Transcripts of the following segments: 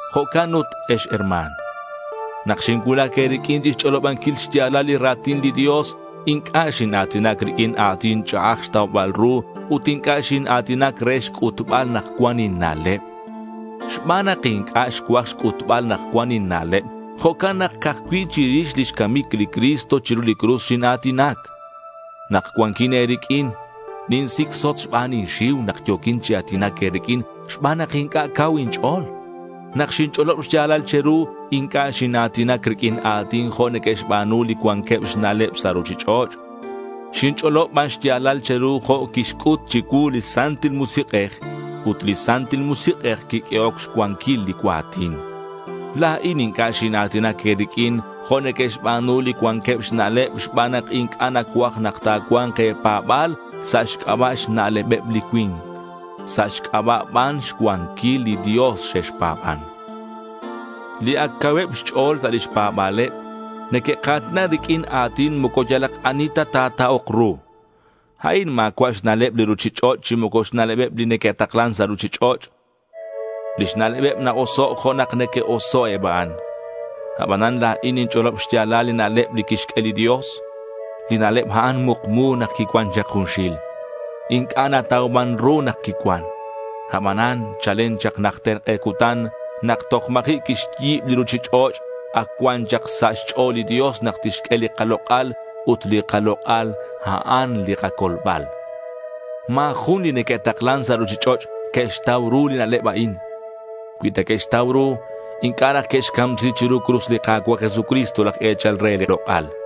Jo'can ut ex herma̱n, nak xincuulac e̱riq'uin chixch'olobanquil xya̱lal li ra̱tin li Dios, inc'a' xina̱tinac riq'uin a̱tin ch'a'aj xtaubal ru ut inc'a' xina̱tinac re xc'utbal nak cuan inna'leb. Xban nak inc'a' xcuaj xc'utbal nak cuan inna'leb, jo'can nak ca'aj cui' chirix lix camic li Cristo chiru li cruz xina̱tinac. Nak cuanquin e̱riq'uin ninsicsot xban inxiu nak yo̱quin chi a̱tinac e̱riq'uin xban nak inc'a' cau inch'o̱l. Nak xinch'olob xya̱lal che̱ru inc'a' xina̱tinac riq'uin a̱tin jo' neque'xba̱nu li cuanqueb xna'leb sa' ruchich'och'. Xinch'olob ban xya̱lal che̱ru jo' quixc'ut chicuu li Santil Musik'ej, ut li Santil Musik'ej quiq'uehoc xcuanquil li cua̱tin. La̱in inc'a' xina̱tinac e̱riq'uin jo' neque'xba̱nu li cuanqueb xna'leb xban nak inc'a' nacuaj nak ta̱cua̱nk e̱pa̱ba̱l sa' xc'aba' xna'lebeb li cui̱nk; sa' xc'aba' ban xcuanquil li Dios xexpa̱ban. Li ac cauheb xch'o̱l sa' lix pa̱ba̱leb, neque'ka̱tina riq'uin a̱tin moco yalak ani ta ta̱ta'ok ru. A'in ma̱cua' xna'leb li ruchich'och' chi moco xna'lebeb li neque'taklan sa' ruchich'och'. Lix na'lebeb na-oso' jo' nak neque'oso' eb a'an. Abanan la̱in ninch'olob xya̱lal li na'leb li quixq'ue li Dios. Li na'leb a'an mukmu nak quicuan chak junxil. Inc'a' natauman ru nak quicuan. Abanan chalen chak najter k'e cutan nak toj ma̱ji' quixyi̱b li ruchich'och' ac cuan chak sa' xch'o̱l li Dios nak tixq'ue li kalok'al ut li kalok'al, a'an li kacolbal. Ma̱ jun li neque'taklan sa' ruchich'och' que'xtau ru li na'leb a'in. Cui ta que'xtau ru, inc'a' raj que'xcamsi chiru cruz li Ka̱cua' Jesucristo, laj e̱chal re li lok'al.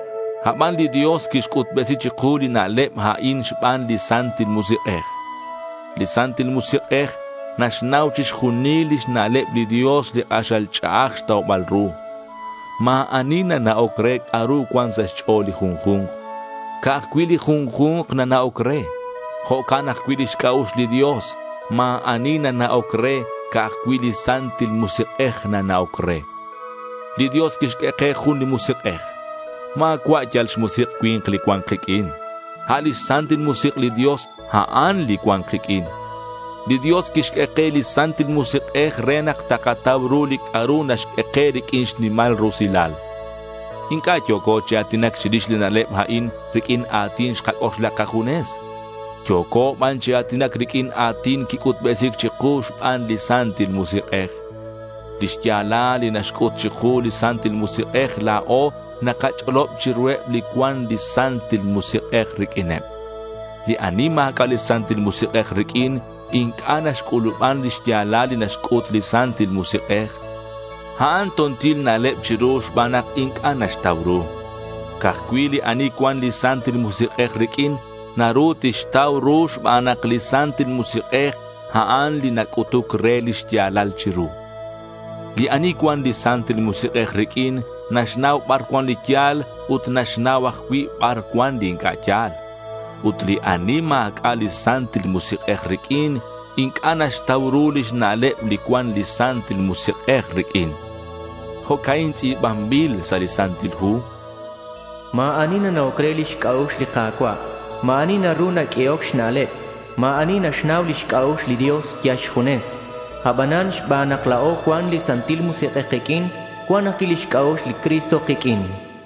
Aban li Dios quixc'utbesi chiku li na'leb a'in xban li Santil Musik'ej. Li Santil Musik'ej naxnau chixjunil lix na'leb li Dios li k'axal ch'a'aj xtaubal ru. Ma̱ ani nana'oc re c'a'ru cuan sa' xch'o̱l li junju̱nk. Ca'aj cui' li junju̱nk nana'oc re. Jo'can ajcui' lix c'a'ux li Dios. Ma̱ ani nana'oc re. Ca'aj cui' li Santil Musik'ej nana'oc re. Li Dios quixq'ue ke jun li Musik'ej. Ma̱cua' yal xmusik' cui̱nk li cuan kiq'uin. A' lix Santil Musik' li Dios, a'an li cuan kiq'uin. Li Dios quixq'ue ke li Santil Musik'ej re nak takatau ru li c'a'ru naxq'ue ke riq'uin xnimal rusilal. Inc'a' yo̱co chi a̱tinac chirix li na'leb a'in riq'uin a̱tin xkac'oxla kajunes. Yo̱co ban chi a̱tinac riq'uin a̱tin quic'utbesi̱c chiku xban li Santil Musik'ej. Li xya̱lal li naxc'ut chiku li Santil Musik'ej la̱o nakach'olob chiruheb li cuan li Santil Musik'ej riq'uineb. Li ani ma̱c'a' li Santil Musik'ej riq'uin inc'a' naxc'u̱luban li xya̱lal li naxc'ut li Santil Musik'ej. A'an to̱ntil na'leb chiru xban nak inc'a' naxtau ru. Ca'aj cui' li ani cuan li Santil Musik'ej riq'uin naru tixtau ru xban nak li Santil Musik'ej a'an li nac'utuc re li xya̱lal chiru. Li ani cuan li Santil Musik'ej riq'uin naxnau bar cuan li ya̱l ut naxnau ajcui' bar cuan li inc'a' ya̱l. Ut li ani ma̱c'a' li Santil Musik'ej riq'uin inc'a' naxtau ru lix na'leb li cuan li Santil Musik'ej riq'uin. Jo'ca'in tz'i̱banbil sa' li Santil Hu: Ma̱ ani nana'oc re lix c'a'ux li Ka̱cua'. Ma̱ ani naru naq'uehoc xna'leb. Ma̱ ani naxnau lix c'a'ux li Dios yal xjunes. Abanan xban nak la̱o cuan li Santil Musik'ej kiq'uin, cuan ajcui' lix c'a'ux li Cristo kiq'uin.